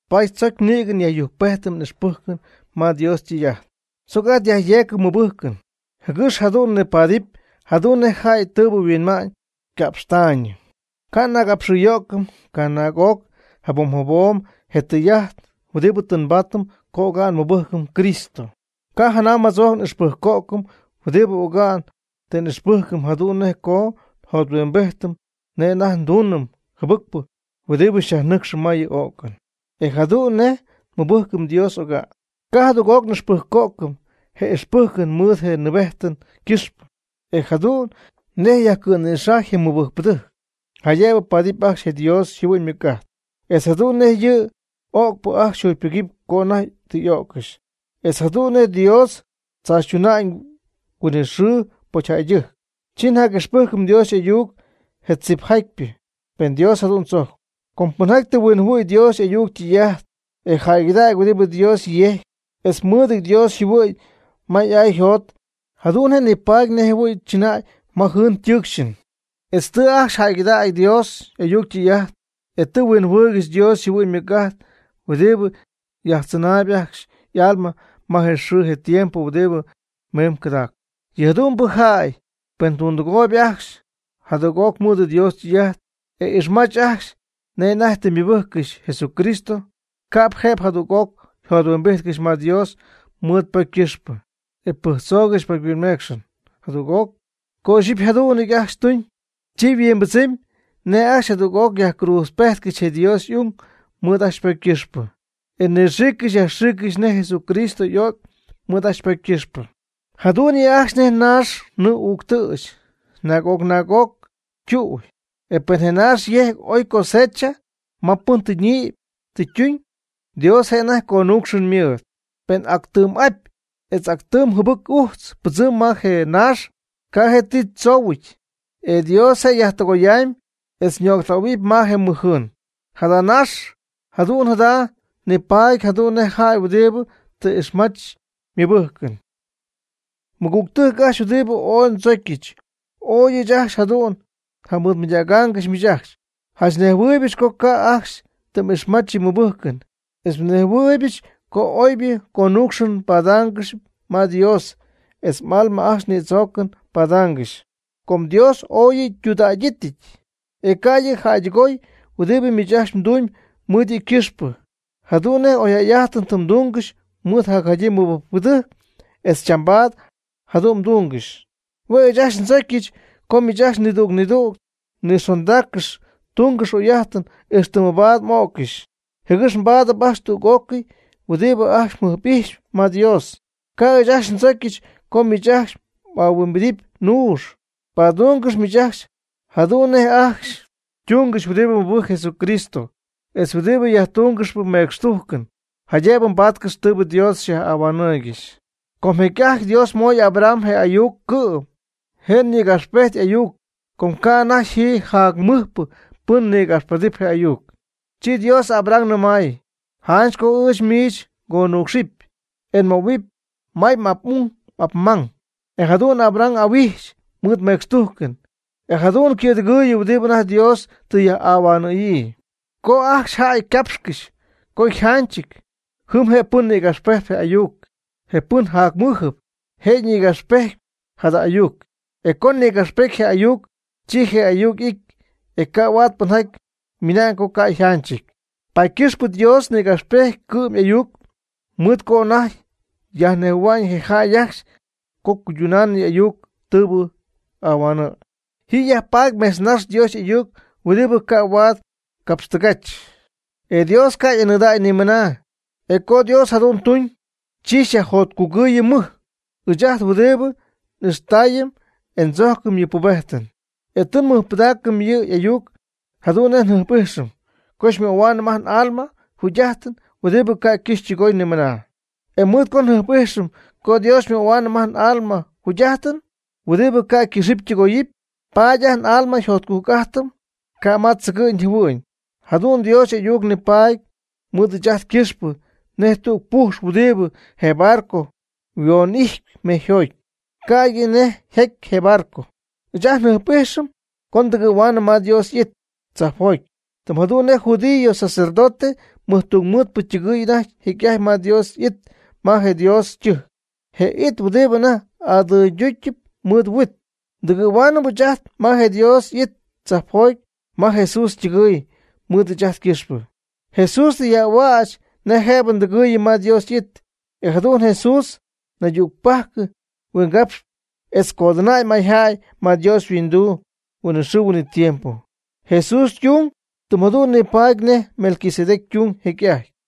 Paady tzoc nïgɨ yajyujcpejtɨm n'ixpɨjcɨn ma Dios ytɨy'ajt, tzoc ajt yajyeecɨm nmɨbɨjcɨn, jɨgɨx jadu'n nipaadɨp jadu'n nej jäy tɨɨbɨ yhuinma'ñ yca'pxtaayñɨ. Ca' n'agapxɨyo'cɨm canaag'oc jabom jabom je tɨy'ajt huɨdibɨ tɨ nbaatɨm co oga'n nmɨbɨjcɨm Cristo. Ca' janam jatzojc n'ixpɨjco'cɨm huɨdibɨ oga'n tɨ n'ixpɨjcɨm jadu'n nej co njothuimbijtɨm nej anajty ndunɨm jɨbɨcpɨ huɨdibɨ xyajnɨcxɨm ma yɨ o'cɨn, e jadu'n nej nmɨbɨjcɨm Dios oga'n. Ca' jadüg'oc n'ixpɨjco'cɨm je ixpɨjcɨn mɨɨd je nɨɨbejtɨn ycɨxpɨ, etz jadu'n nej yajcɨ̈nïxajy je mɨbɨjcpɨdɨjc jaydëbɨ paadɨp ajcxy je Dios yjɨhuɨ'ñ ymɨc'ajt, etz jadu'n nej yɨ öcpɨ ajcxy yjugypɨgɨpy co anajty tɨ öccɨxy, etz jadu'n nej Dios tzaachytuna'ñ huinɨxɨɨ pocyjäydɨjc. Chi njac'ixpɨjcɨm Dios y'ayuc je tzipjatypɨ, pen Dios jadu'n tzojcpy. Com pɨnjaty tɨ huinjɨhuɨ̈y Dios y'ayuc ytɨy'ajt, e jäygɨdägy huɨdibɨ Dios yejcpy, etz mɨɨdɨty Dios yjɨhuɨ'ñ ma y'ay yjot, jadu'n je' nipaady nejjɨhuɨ̈y chɨnay ma jɨɨn ytɨɨcxɨn. Etz tɨ ajcxy jäygɨdägy Dios y'ayuc ytɨy'ajt, e tɨ jɨhuɨɨygɨxy Dios yjɨhuɨ'ñ ymɨc'ajt huɨdibɨ yajtzɨnaayɨp ajcxy y'alma ma je xɨɨ je tiempo huɨdibɨ miimb cɨdacp. Yɨ jadu'mbɨ jäy, pen tundɨgooyb ajcxy jadüg'oc mɨɨd Dios ytɨy'ajt, e ixmach ajcxy nej anajty tɨ mɨbɨjccɨxy Jesucristo, ca'p jëbɨ jadüg'oc jothuimbijtcɨxy ma Dios mɨɨd pocy ycɨxpɨ e pɨjctzoogɨxy pocyhuinmeecxɨn jadüg'oc. Co ixyipy jadu'n ajcxy tuñ, chi huimbɨdzɨmy nej ajcxy jadüg'oc yajcruudzpejtcɨxy je Dios y'ung mɨɨd ajcxy ypocy ycɨxpɨ, e nɨxiiccɨxy yajxiiccɨxy nej Jesucristo y'o'cy mɨɨd ajcxy ypocy ycɨxpɨ. Jadu'n yɨ' ajcxy nej naax nɨɨ'uuctɨ̈ch naag'oc naag'oc ytu'y. E pen je naax yejcpy ooy cosecha ma pɨn tɨ ñïpy tɨ ytuñ, Dios je' anajty yconuucxɨn ymɨɨd. Pen actɨm apy etz actɨm jɨbɨc ujtz ypɨdzɨmy ma je naax, ca' je' ti tzoohuɨty, e Dios je' yajtɨgoyamb etz nöctähuɨp ma je mɨj jɨɨn. (Jada naax jadu'n jada' nipaady jadu'n nej jäy huɨdibɨ tɨ ixmach ymɨbɨjcɨn.) Mɨgügtɨjc ajcxy huɨdibɨ ooy ndzocyɨch, oy ɨɨch ajcxy jadu'n njamɨɨdmɨydägyɨch miich ajcxy, janch nejhuɨɨybɨch co ca' ajcxy tɨ m'ixmach yɨ mɨbɨjcɨn, etz nejhuɨɨybɨch co oybɨ conuucxɨn mbaadaangɨxyp ma Dios etz m'alma ajcxy nïdzoocɨn paadaangɨxy. Com Dios ooy yɨ' ytudägyɨty, e ca' yɨ' jäydɨgoy huɨdibɨ miich ajcxy mdumyb mɨɨd yɨ' ycɨxpɨ, jadu'n nej oyjäy'ajtɨn tɨ mdungɨxy mɨɨd jacjadyii mɨbɨjcpɨdɨjc, e chambaad jadu'n mdungɨxy. Hue' ɨɨch ajcxy ndzocyɨch co miich ajcxy nidüg nidüg mnixondaaccɨx tungɨx oyjäy'ajtɨn ixtɨ mabaad m'öccɨxy, jɨgɨx mbaadɨpy ajcxy tüg'ócɨy huɨdibɨ ajcxy mjɨjp'ijxyp ma Dios. Ca' ɨɨch ajcxy ndzojccɨxy co miich ajcxy m'ahuimbidɨpy nuux. Padungɨx miich ajcxy jadu'n nej ajcxy ytungɨxy huɨdibɨ mɨbɨjcp Jesucristo etz huɨdibɨ yajtungɨxp mecxtujcɨn, jaydëbɨ mbaatcɨxy tɨɨbɨ Dios xyaj'ahuanɨɨygɨxy. Co jecy'ajty Dios moy Abraham je' y'ayuc, cɨ'm je' nïgapxpejty y'ayuc, com ca'anajty ji jac mɨjpɨ pɨn nïgapxpedɨpy je' y'ayuc. Chi Dios Abraham nɨmay: “Janch co ɨɨch miich ngonucxɨp, e nmöhuɨpy may m'ap'ung m'apmang.” E jadu'n Abraham y'ahuijxy mɨɨd mecxtujcɨn, e jadu'n ycɨ̈dɨgɨɨyɨ huɨdibɨ anajty Dios tɨ yaj'ahuanɨ̈yii. Co ajcxy jäy ycapxcɨxy co yjanchɨty, jɨm je' pɨn ñïgapxpejtp je y'ayuc, je pɨn jacmɨjɨp, je' nïgapxpejtpy jada ayuc. E co nïgapxpety je' y'ayuc, chi je ayuc y'ity, e ca' huaad pɨnjaty ymɨna'ñ co ca' yjanchɨty. Paady ycɨxpɨ Dios nïgapxpejty ycɨ'm'ayuc, mɨɨd co anajty yajnejhuɨ̈hua'ñ je jäy ajcxy co cuyduna'ñ y'ayuc tɨɨbɨ ahuanɨ̈y. Ji yajpaady mejtznax Dios y'ayuc huɨdibɨ ca' huaad capxtɨgach, e Dios ca' y'anɨɨdägy nimɨna. E co Dios jadu'n tuñ, chi xyajjotcugɨɨyɨm mɨj, ɨɨch ajt huɨdibɨ n'ixtaayɨm e ndzojcɨm yɨ' ypubejtɨn. E tɨ nmɨjpɨdaacɨm yɨ' y'ayuc jadu'n nej jɨjp'ijxɨm co xymöhuaanɨm ajt n'alma jugy'ajtɨn huɨdibɨ ca' ycɨxɨpy ytɨgoyɨpy ni mɨna. E mɨɨd co njɨjp'ijxɨm co Dios xymöhuaanɨm ajt n'alma jugy'ajtɨn huɨdibɨ ca' ycɨxɨpy ytɨgoyɨpy, paady ajt n'alma jotcujc ijtɨm ca' ma tzɨgɨ'ñ jɨhuɨ'ñ. Jadu'n Dios y'ayuc nipaady mɨɨd ɨɨch ajt ycɨxpɨ nej tüg pujx huɨdibɨ je barco huon'ijtp mejyjoty, ca'ydɨ nej yjaty je barco. Ɨɨch ajt njɨjp'ijxɨm co ndɨgɨ̈huaanɨm ma Dios y'it tzajpjoty, tɨm jadu'n nej je judío sacerdote mɨjtungmɨɨdpɨ ytɨgɨ̈y anajty jecy'ajty ma Dios y'it ma je Dios ytɨjc, je it huɨdibɨ anajty adɨyducyɨp mɨɨd huit. Tɨgɨ̈huaanɨm ɨɨch ajt ma je Dios y'it tzajpjoty ma Jesús ytɨgɨ̈y mɨɨd ɨɨch ajt ycɨxpɨ, Jesús tɨ yaj'ahuäch nej jëbɨ ndɨgɨɨyɨm ma Dios y'it. E jadu'n Jesús naydügpajc huingapxy etz codɨnäy mayjäy ma Dios yhuinduu huinɨxɨɨ huinɨtiempo. Jesús ytung tɨm jadu'n nipaady nej Melquisedec ytuñ jecy'ajty.